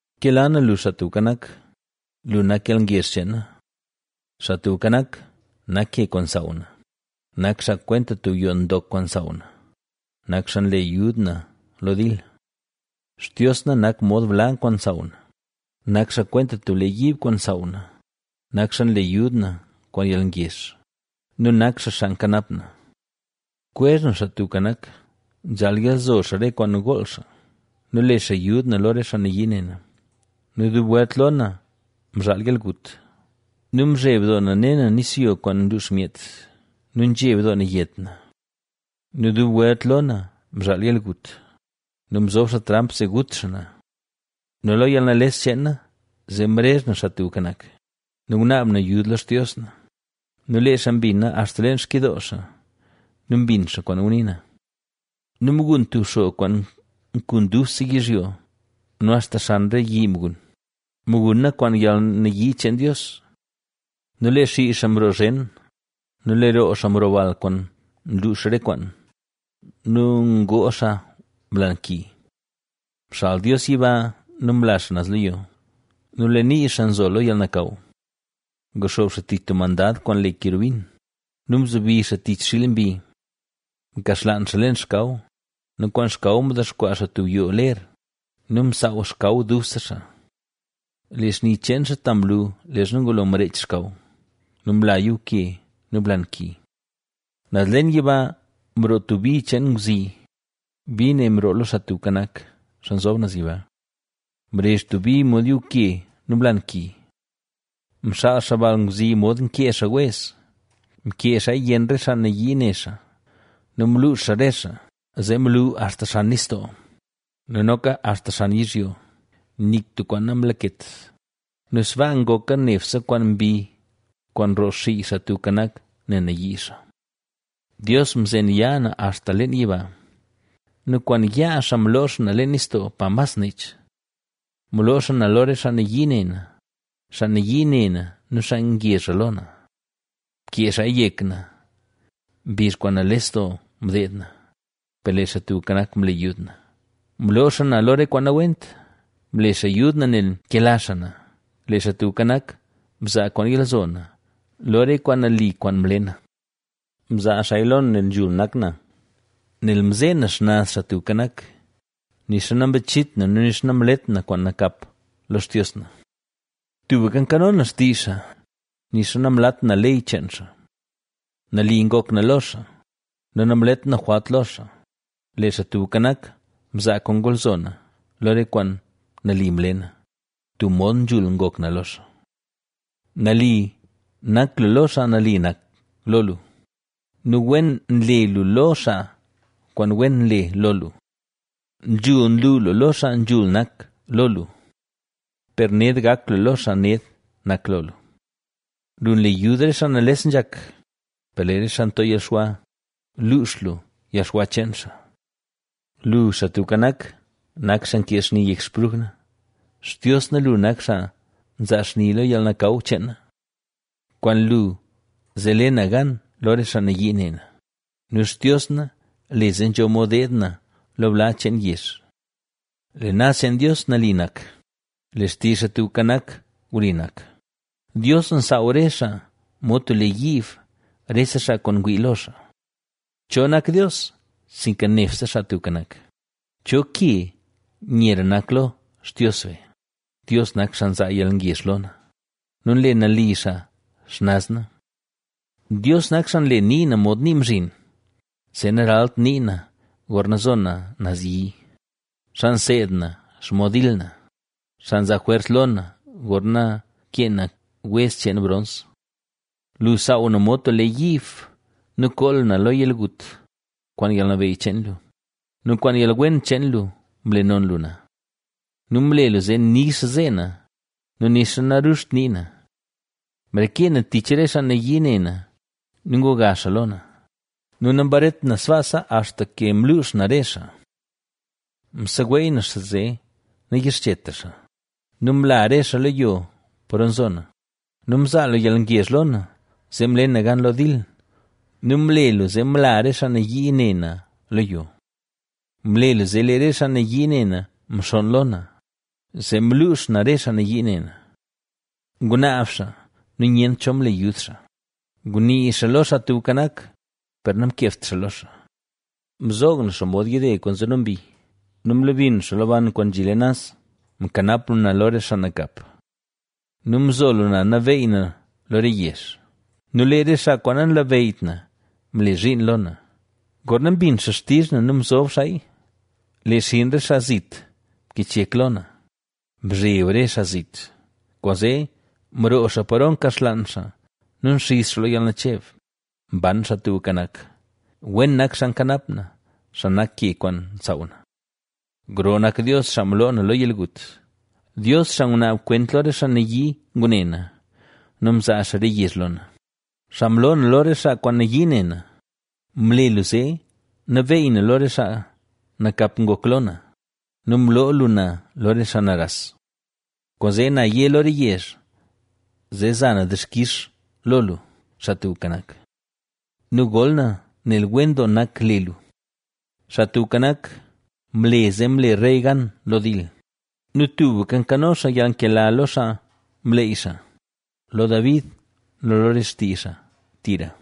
Nkela na lu Xaa Tubka Nak; lu nak yalngezh cheen na. Xaa Tubka Nak nak ke kwaan nsaaw na, nak xaa kwenta tub yoo ndok kwaan nsaaw na, nak xaa nle yud na lo dil. Xtios na nak mod bla kwaan nsaaw na, nak xaa kwenta tub lee yiib kwaan nsaaw na, nak xaa nle yud na kwaan yalngezh nu nak xaa xaa nkanap na. Kwezh na Xaa Tubka Nak, nzhaal yalzo xaa re kwaan gool xaa nu le xaa yud na lo re xaa nayii ne na. Nu dub welt lo na mzhaal yalgut nu mzheb doo na ne na nisyo kwaan nluux myet nu nzheb doo na yet na. Nu dub welt lo na mzhaal yalgut nu mzob xaa tramp zee gut xaa na. Nu lo yalnales cheen na zee mrezh na Xaa Tubka Nak nu ngunaab na yud lo Xtios na nu lee xaa mbina axta leen xkidoo xaa nu mbin xaa kwaan ngunii na. Nu mgun tub xog kwaan mkun dubse yizhyo nu axta xan re yi mgun; mguna kwaan yalnayii cheen Dios. Nu lee xii xaa mroo zhen nu lee roo xaa mroo bal kwaan mluux re kwaan nu mloo xaa blan ki. Mxal Dios yiba nu mla xaa naz lo yo nu lee nii xaa nzo lo yalnakaw. Nguxoob xaa tich tub mandad kwaan le kerubin nu mzobi xaa tich xiil mbi. Mkaxlaan xaa leen xkaw nu kwaan xkaw mdexkwaa xaa tub yoo ler nu msaaw xkaw dubse xaa. Lee xni cheen xaa ta mlu, leezha ngulo mreech xkaw nu mla yuuke nu blan ki. Naz leen yiba mroo tub bi cheen ngwzi, bi ne mroo lo Xaa Tubka Nak, Xaa Nzob Naz Yiba. Mrezh tub bi mod yuuke nu blan ki. Mxaal xaa bal ngwzi mod nkee xaa wez, mkee xaaya yenn re xaa nayii ne xaa nu mluux xaa re xaa. Zee mlu axta xan nistoo nu noka axta xan yizhyo, nik tub kwaan namlaket nu sbaa ngoka nebse kwaan mbi kwaan nroo xii Xaa Tubka Nak, nel nayii xaa. Dios mzen yaa na axta leen yiba nu kwaan yaa xaa mloo xaa na leen nistoo, pa mas nech. Mloo xaa na lo re xaa nayii ne na, xaa nayii ne na nu xaa ngezhra lo na. Mkee xaaya yek na mbizh kwaan nales doo mdeed na, per lee Xaa Tubka Nak, mle yud na: mloo xaa na lo re kwaan nawent, mle xaa yud na nel mkela xaa na. Lee Xaa Tubka Nak, mzaa kwaan yalzo na, lo re kwaan nali kwaan mle na; mzaa xaaya lo na nel nzhul nak na. Nel mzee na xnaz Xaa Tubka Nak, nixa nambachit na nu nixa namlet na kwaan nakap lo Xtios na. Tubka nkano na xtizh xaa, nixa namlat na ley cheen xaa. Nali ngok na lo xaa, nu namlet na jwalt lo xaa; Lee Xaa Tubka Nak, mzaa kwaan ngolzo na, lo re kwaan nali mle na, tub mod nzhul ngok na lo xaa. Nali nak lu lo xaa nali nak lo lu nu wen nle lu lo xaa kwaan wen nle lo lu. Nzhul nlu lu lo xaa nzhul nak lo lu, per ned gak lu lo xaa ned nak lo lu. Lu nle yud re xaa nales nzhak, per lee re xaa nto yalxwa, luux lu yalxwa cheen xaa. Lu, Xaa Tubka Nak, nak xaa nkee xni yek xpruj na; Xtios na, lu nak xaa nzaa xni lo yalnakaw cheen na. Kwaan lu zee le na gan lo re xaa nayii ne na nu Xtios na le zee nzho mod deed na lo bla cheen yezh. Lee naz cheen Dios nali nak, lee xtizh Xaa Tubka Nak wli nak, Dios nsaaw re xaa mod tub lee yiib rese xaa kwaan ngwii lo xaa. ¿Cho nak Dios, sinka nebse Xaa Tubka Nak? ¿Cho ke nyera nak lo Xtios be? Dios nak xaa nzaa yalngezh lo na nu nle nali xaa xnaz na. Dios nak xaa nle nii na mod nii mzhin, zee naralt nii na gorna zo na naz yi, xaa nseed na xomod dil na, xaa nzaa jwers lo na gorna kee na wez cheen brons. Lu saaw na mod tub lee yiib nu koo lu na lo yalgut; kwaan yalnabeyy cheen lu nu kwaan yalwen cheen lu mle non lu na. Nu mle lu zee nix zee na nu nixa naruzht nii na. Mrekee na tich re xaa nayii ne na nu nguga xaa lo na nu nambaret na sbaasa axta ke mluux na re xaa. Mseweey na xaa zee nayixchetra xaa nu mla re xaa lo yo paro nzo na. Nu mzaa lu yalngezh lo na zee mle na gan lo dil nu mle lu zee mla re xaa nayii ne na lo yo. Mle lu zee lee re xaa nayii ne na mxonn lo na, zee mluux na re xaa nayii ne na. Ngunaab xaa nu nyent cho mle yud xaa, ngunii xaa lo Xaa Tubka Nak, per namkebt xaa lo xaa. Mzoog na xaa mod yide kwaan nzeno mbi nu mlebi na xaa lo ban kwaan nzhi leen naz. Mkanap lu na lo re xaa nakap nu mzo lu na nabeey na lo re yezh nu lee re xaa kwaan nanlabeyyt na mle zhiin lo na. Gorna mbin xaa xtizh na nu mzob xaaya; lee xinn re xaa zit mkich yek lo na. Mzheb re xaa zit, kwaanzee mroo xaa paro mkaxlaan xaa nu mxiz xaa lo yalnacheb. ¡Mban Xaa Tubka Nak! ¡Wen nak xaa nkanap na, xaa nak ke kwaan nsaaw na! ¡Gro nak Dios xaa mloo na lo yalgut! Dios xaa ngunaab kwent lo re xaa nayii ngune na, nu mzaa xaa re yezh lo na, xaa mloo na lo re xaa kwaan nayii ne na, mle lu zee nabeey na lo re xaa nakap ngok lo na nu mloo lu na lo re xaa naras. Kwaanzee na yé lo re yezh zee za na dixkix lo lu, Xaa Tubka Nak, nu gol na nel wen doo nak le lu. Xaa Tubka Nak, mle zee mle rey gan lo dil nu tubka nkano xaa yalnkela lo xaa mleey xaa, lo David nu lo re xtii xaa tira.